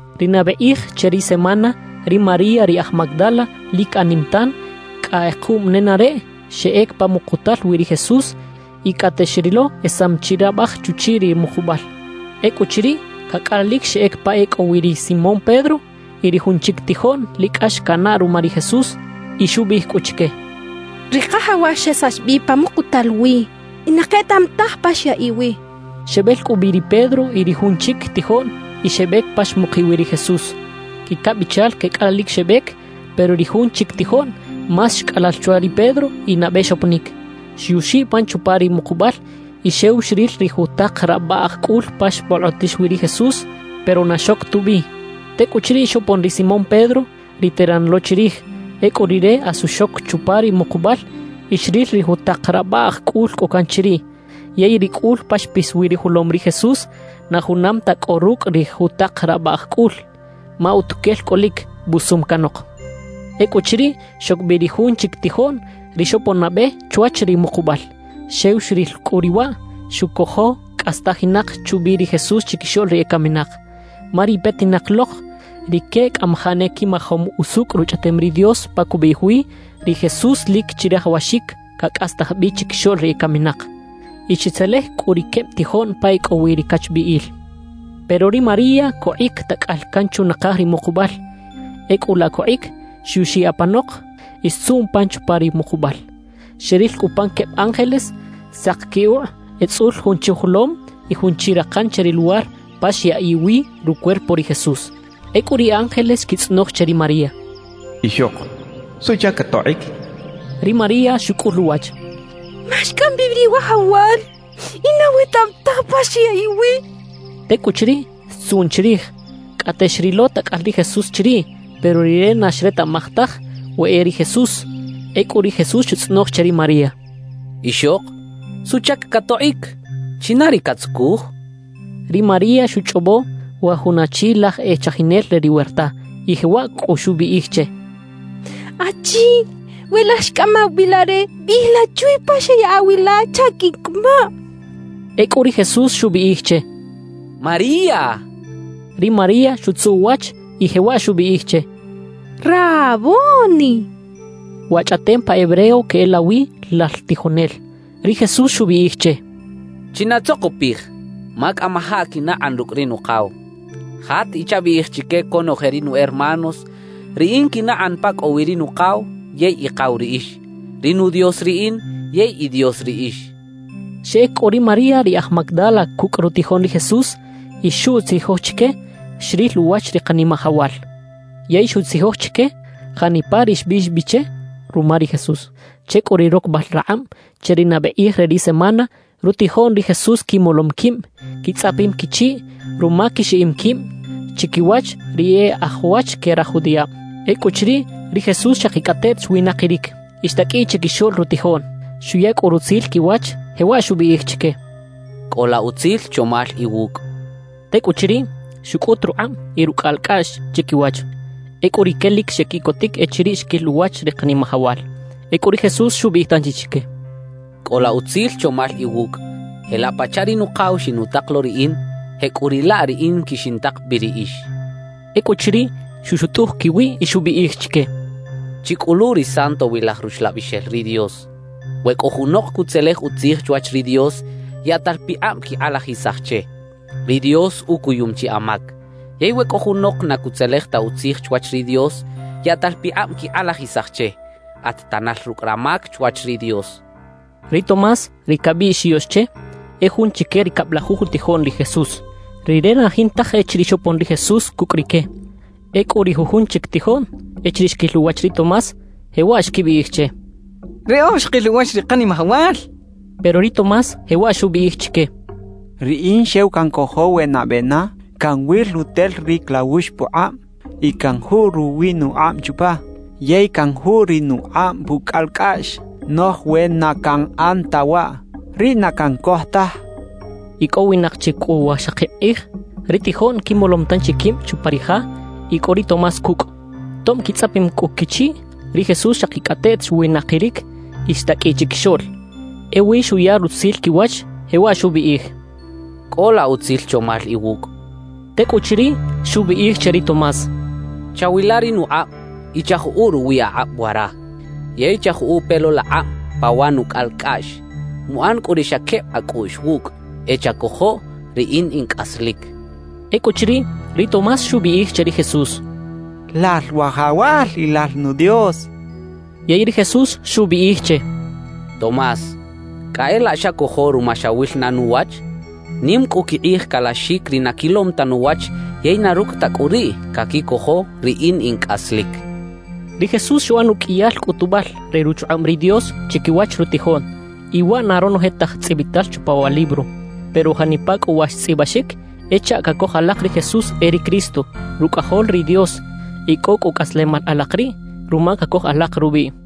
Ri nabe kꞌij che ri semana, ri María ri aj Magdala lic anim tan, cꞌa kꞌekuꞌm nenareꞌ, xeꞌec pa mukutal wi ri Jesús. Y cꞌate xrilo esam chi rabaj chuchiꞌ ri mukubal. Ecꞌuchiriꞌ, cacꞌalalic xeꞌec pa e cꞌo wi ri Simón Pedro y ri jun chic tijoꞌn lic cꞌax canaꞌ ruma ri Jesús, y xubiꞌij cꞌu chique: —Ri Kajawal xesax bi pa mukutal wi y na ketaꞌam taj pa xyaꞌiꞌ wi —xchaꞌ. Xebel cꞌu bi ri Pedro y ri jun chic tijoꞌn, y xebec pa xmukiꞌ wi ri Jesús. Quicabichal quecꞌalalic xebec; pero ri jun chic tijoꞌn más xcꞌalal chwa ri Pedro y nabe xoponic. Xyuxiꞌ pan chupa ri mukubal y xew xril ri jutak rabaꞌj cꞌul pa xbolkꞌotix wi ri Jesús, pero na xoc tubi. Tecꞌuchiriꞌ xopon ri Simón Pedro, ri teran lo chirij. Ecꞌu rire asu xoc chupa ri mukubal y xril ri jutak rabaꞌj cꞌul cꞌo can chiriꞌ. Yey ri cꞌul pa xpis wi rujolom ri Jesús, na junam ta cꞌo rucꞌ ri jutak rabaꞌj cꞌul; ma utuquel cꞌolic, busum canok. Ecꞌuchiriꞌ, xoc bi ri jun chic tijoꞌn ri xopon nabe chwach ri mukubal. Xew xril cꞌu riꞌ waꞌ, xucojo cꞌastajinak chubi ri Jesús chiquixoꞌl ri ecaminak. Ma ri petinak lok rique cꞌamajaꞌ ne quimajom usucꞌ Ruchꞌaꞌtem ri Dios pa cubiꞌij wi: Ri Jesús lic chirajawaxic cacꞌastaj bi chiquixoꞌl ri ecaminak. Y xetzelej cꞌu ri queb tijoꞌn pa e cꞌo wi ri cachbiꞌil. Pero ri María cokꞌic tacꞌal can chunakaj ri mukubal. Ecꞌu laꞌ cokꞌic, xyuxiꞌ apanok y xtzuꞌn pan chupa ri mukubal. Xeril cꞌu pan queb ángeles sak quikꞌuꞌ etzꞌul jun chuꞌjolom y jun chi rakan che ri luwar pa xyaꞌiꞌ wi rucuerpo ri Jesús. Ecꞌu ri ángeles xquitzꞌonoj che ri María: —Ixok, ¿suꞌchac catokꞌic? —xechaꞌ. Ri María xucꞌul uwach: —Ma xcꞌam bi ri Wajawal y na wetaꞌam taj pa xyaꞌiꞌ wi —xchaꞌ. Tecꞌuchiriꞌ, xtzuꞌn chirij. Cꞌate xrilo tacꞌal ri Jesús chiriꞌ, pero rire na xretaꞌmaj taj we e ri Jesús. Ecꞌu ri Jesús xutzꞌonoj che ri María: —Ixok, ¿suꞌchac catokꞌic? ¿China ri catzucuj? —xchaꞌ. Ri María xuchꞌobo wa jun achi laj e chajinel re ri werta, y jewaꞌ cꞌu xubiꞌij che: —Achi, we lal xcꞌamaw bi la re, biꞌij la chwe pa xeꞌyaꞌa wi la chaꞌ quiꞌncꞌamaꞌ —xchaꞌ. Ecꞌu ri Jesús xubiꞌij che: —¡María! —xchaꞌ. Ri María xutzuꞌ uwach y jewaꞌ xubiꞌij che: —¡Raboni! (Wa chꞌaꞌtem pa hebreo queꞌelawi: “Lal tijonel”.) Ri Jesús xubiꞌij che: —Chinatzokopij, ma cꞌamajaꞌ quinakꞌan rucꞌ ri Nukaw. Jat y chabiꞌij chique conoje ri nu hermanos: Riꞌin quinakꞌan pa cꞌo wi ri Nukaw yey Ikaw riꞌix; ri nu Dios riꞌin yey i Dios riꞌix —xchaꞌ. Xeꞌec cꞌu ri María ri aj Magdala cucꞌ rutijoꞌn ri Jesús y xuꞌtzijoj chique xril uwach ri Kanimajawal. Yey xutzijoj chique janipa ri xbiꞌx bi che ruma ri Jesús. Che cꞌu ri rocbal rakꞌab che ri nabe kꞌij re ri semana, rutijoꞌn ri Jesús quimolom quib, quitzꞌapim quichiꞌ ruma quixiꞌim quib chiquiwach ri e aj wach que raj judiꞌab. Ecꞌuchiriꞌ, ri Jesús xakicꞌateꞌt xwinakiric y xtaqꞌuiꞌ chiquixoꞌl rutijoꞌn. Xuya cꞌu rutzil quiwach, jewaꞌ xubiꞌij chique: —Cꞌola utzil chomal iwucꞌ —xchaꞌ. Tecꞌuchiriꞌ, xucꞌut rukꞌab y rucꞌalcꞌaꞌx chiquiwach. Ecꞌu rique lic xequiꞌcotic echiriꞌ xquil uwach ri Kanimajawal. Ecꞌu ri Jesús xubiꞌij tanchi chique: —Cꞌola utzil chomal iwucꞌ. Jelaꞌ pachaꞌ ri Nukaw xinutak lo riꞌin, jecꞌuriꞌlaꞌ riꞌin quixintak bi riꞌix —xchaꞌ. Ecꞌuchiriꞌ, xuxutꞌuj quiwiꞌ y xubiꞌij chique: —Chicꞌulu ri Santowilaj Ruxlabixel ri Dios. We cꞌo junok cutzelej utzij chwach ri Dios, yaꞌtal pikꞌab quikꞌalajisaj che: “Ri Dios ucuyum chi amac.” Yey we cꞌo junok na cutzelej ta utzij chwach ri Dios, yaꞌtal pikꞌab quikꞌalajisaj che: “At tanal rucꞌ ramac chwach ri Dios” —xchaꞌ. Ri Tomás ri cabiꞌx “yoꞌx” che, e jun chique ri cablajuj utijoꞌn ri Jesús. Rire na jintaj echiriꞌ xopon ri Jesús cucꞌ rique. Ecꞌu ri jujun chic tijoꞌn echiriꞌ xquil uwach ri Tomás, jewaꞌ xquibiꞌij che: —¡Riꞌoj xkil uwach ri Kanimajawal! —xechaꞌ. Pero ri Tomás jewaꞌ xubiꞌij chique: —Riꞌin xew cancojo we nabe na canwil rutel ri clawux pukꞌab y canjuꞌ ruwi nukꞌab chupa yey canjuꞌ ri nukꞌab pucꞌalcꞌaꞌx. Noꞌj we na canꞌan ta waꞌ, riꞌ na cancoj taj —xchaꞌ. Icꞌowinak chi cꞌu wajxakib kꞌij, ri tijoꞌn quimolom tanchi quib chupa ri ja y cꞌo ri Tomás cucꞌ. Tob quitzꞌapim cꞌu quichiꞌ, ri Jesús xakicꞌateꞌt xwinakiric y xtaqꞌuiꞌ chiquixoꞌl. Ewi xuya rutzil quiwach, jewaꞌ xubiꞌij: —Cꞌola utzil chomal iwucꞌ —xchaꞌ. Tecꞌuchiriꞌ, xubiꞌij che ri Tomás: —Chawila ri nukꞌab y chajuꞌu ruwi akꞌab wara, yey chajuꞌu pe lo laꞌkꞌab pa wa nucꞌalcꞌaꞌx. Muꞌan cꞌu ri xa queb acꞌuꞌx wucꞌ; e chacojoꞌ riꞌin in cꞌaslic —xchaꞌ. Ecꞌuchiriꞌ, ri Tomás xubiꞌij che ri Jesús: —¡Lal Wajawal y Lal nu Dios! —xchaꞌ. Yey ri Jesús xubiꞌij che: —Tomás, cꞌa e laꞌ xacojo ruma xawil na nuwach. Nim cꞌu quikꞌij calaxic ri na quilom ta nuwach yey na rucꞌ ta cꞌu riꞌ, caquicojo riꞌin in cꞌaslic —xchaꞌ. Ri Jesús xuꞌan uqꞌuiyal cꞌutubal re ruchukꞌab ri Dios chiquiwach rutijoꞌn, y waꞌ na ronoje taj tzꞌibital chupa wa libro. Pero janipa cꞌu wa xtzꞌibaxic, e chaꞌ cacoj alak ri Jesús e ri Cristo, Rucꞌajol ri Dios, y cꞌo cꞌu cꞌaslemal alak riꞌ ruma cacoj alak rubiꞌ.